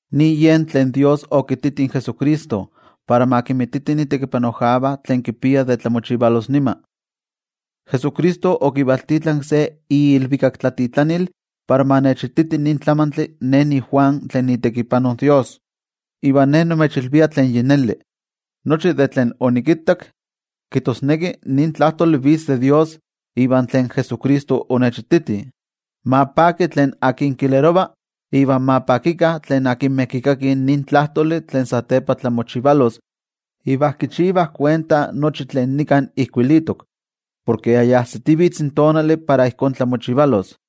Nin yen tlen toYejwatzi okititi in Jesucristo, para ma kinmititi itekipanojkavah tlen kipia de tlamochivalos nima. Jesucristo okivaltitlanki se iilvikaktlatitlanil para ma nechititi nin tlamantli ne, niJuan, tlen niitekipano in toYejwatzi. Iva ne nimechilvia tlen yi neli nochi de tlen onikittak, kijtosneki nin tlajtoli vitz de toYejwatzi iva tlen Jesucristo onechititi. Ma paki tlen kilerova iva ma pakikah tlen kikakih nin tlajtoli tlen satepa tlamochivalos iva kichivah kuenta nochi tlen nika ijkuilitok, porke yi ajsitivitz in tonali para ijkó tlamochivalos.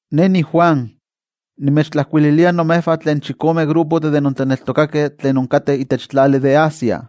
Ne niJuan, nimechtlajkuililia imejvah tlen chikome olololistih de intlaneltokakeh tlen inkateh itech tlali de Asia.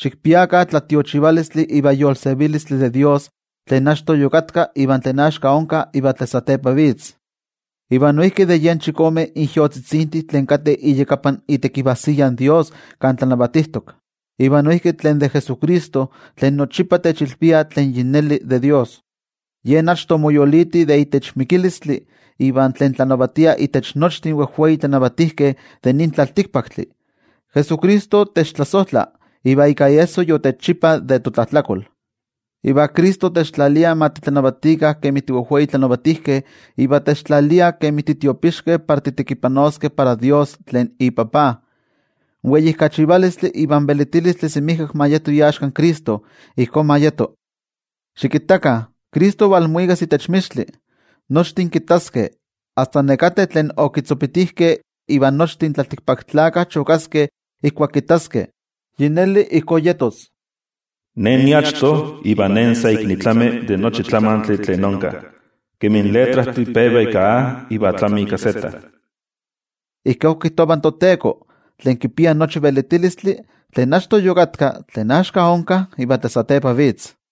Xikpiakah tlatiochivalistli iva yolsevilistli de toYejwatzi tlen achto yokatka, iva tlen axka onka iva tlen satepa vitz, iva noijki de yen chikome ijyotzitzintih tlen kateh iyakapan itekivajsiya in toYejwatzi kan tlanavatijtok, iva noijki tlen de Jesucristo tlen nochipa techilvia tlen yi neli de toYejwatzi. Yen achto omoyoliti de itech mikilistli, iva tlen tlanavatia intech nochtin wejwei tlanavatijkeh de nin tlaltikpaktli. Jesucristo techtlasojtla iva ika iesso yotechchipa de totlajtlakol. Iva Cristo techtlalia ma titlanavatikah kemi tiwejwei titlanavatijkeh iva techtlalia kemi titiopixkeh para titekipanoskeh para toYejwatzi tlen iTajtzi. In weijkachivalistli iva in velitilistli semijkak ma yeto iaxka in Cristo. Ijkó ma yeto. Xikittakah, Cristo valmuikas itech mixtli. Nochtin kittaskeh, asta nekateh tlen okitzopitijkeh. Iva nochtin tlaltikpaktlakah chokaskeh ijkuak kittaskeh. Yi neli, ijkó yetos. “Ne niachto iva Ne sa ik nitlami de nochi tlamantli tlen onka, kemi in letrajtih peva ika A iva tlami ika Z”, ijkó kijtova in toTeko, tlen kipia nochi velitilistli, tlen achto yokatka, tlen axka onka, iva tlen satepa vitz.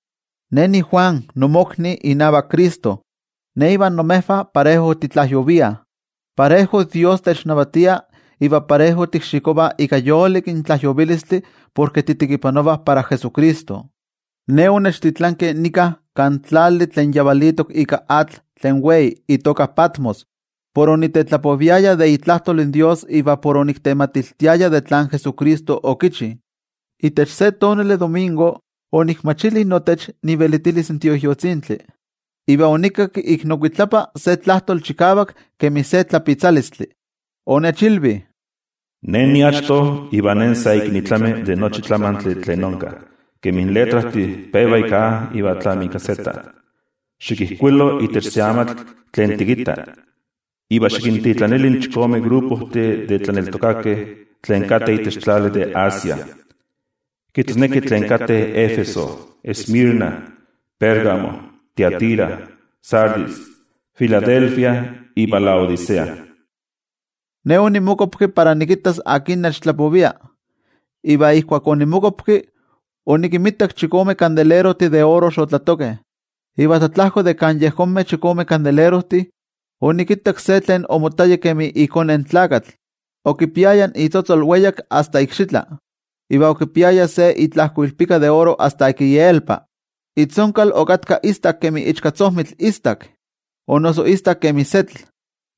Ne niJuan, nimokni inavak Cristo. Ne ivan imejvah parejo titlajyoviah, parejo toYejwatzi technavatia iva parejo tikxikovah ika yolik in tlajyovilistli porke titekipanovah para Jesucristo. Ne onechtitlankeh nika kan tlali tlen yavalitok ika atl tlen wei itoka Patmos por onitetlapoviaya de itlajtol in toYejwatzi iva por oniktematiltiaya tlen Jesucristo okichi. Itech se tonali domingo, onikmachili notech ivelitilis in Tioijyotzintli, iva onikakki ik nokuitlapa se tlajtoli chikavak kemi se tlapitzalistli. Onechilvi: —Ne niachto iva Ne sa ik nitlami de nochi tlamantli tlen onka, kemi in letrajtih peva ika A iva tlami ika Z. Xikijkuilo itech se amatl tlen tikitta, iva xikintitlanili in chikome olololistih de tlaneltokakeh tlen kateh itech tlali de Asia, kijtosneki tlen kateh Éfeso, Esmirna, Pérgamo, Tiatira, Sardis, Filadelfia iva Laodicea. Ne onimokuapki para nikittas akin nechtlapovia, iva ijkuak onimokuapki, onikinmitak chikome kandelerojtih de oro xotlatokeh, iva tlatlajko de kan yejonmeh chikome kandelerojtih, onikittak se tlen omottaya kemi iKone in Tlakatl, okipiaya itzotzol weyak asta ikxitla, iva okipiaya se itlajkoilpika de oro asta ik ielpa. Itzonkal okatka istak kemi ichkatzojmitl istak, o noso istak kemi setl,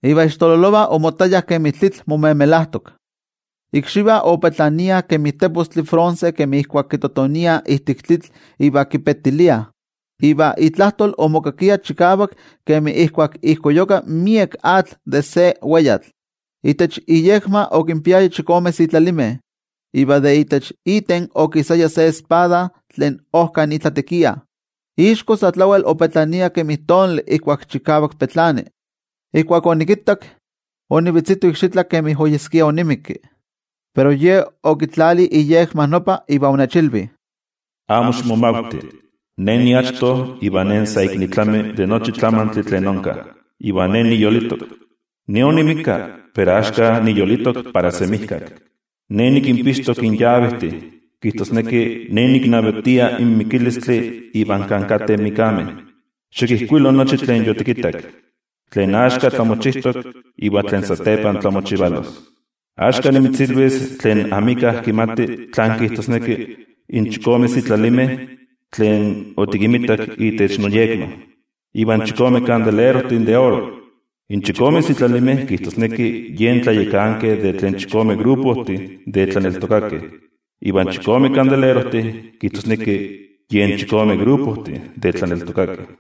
iva ixtololovah omottayah kemi tlitl momemelajtok. Ikxivah opetlaniah kemi tepostli bronce kemi ijkuak kitotoniah ijtik tlitl iva kipetiliah. Iva itlajtol omokakia chikavak kemi ijkuak ijkoyuka miek atl de se weyatl. Itech iyekma okinpiaya chikome sitlalimeh, iva de itech iten okisaya se espada tlen ojka itlatekia. Ixko sa tlawel opetlania kemi tonali ijkuak chikavak petlani. Ijkuak onikittak, onivetzito ikxitlan kemi oyeskia onimikki. Pero Ye okitlali iyekma nopa iva onechilvi: —Amo ximomavti. Ne niachto iva Ne sa ik nitlami de nochi tlamantli tlen onka, iva Ne niyolitok. Ne onixpolika, pero axka niyolitok para semijkak. Ne nikinpixtok in yavejtih, kijtosneki Ne niknavatia in mikilistli iva kan kateh in mikkameh. Xikijkuilo nochi tlen otikittak, tlen axka tlamochijtok, iva tlen satepa tlamochivalos. Axka nimitzilvis tlen amika kimati tlan kijtosneki in chikome sitlalimeh tlen otikinmitak itech noyekma, iva in chikome kandelerojtih de oro. In chikome sitlalimeh kijtosneki yen tlayakankeh de tlen chikome olololistih de tlaneltokakeh. Iva in chikome kandelerojtih kijtosneki yen chikome olololistih de tlaneltokakeh.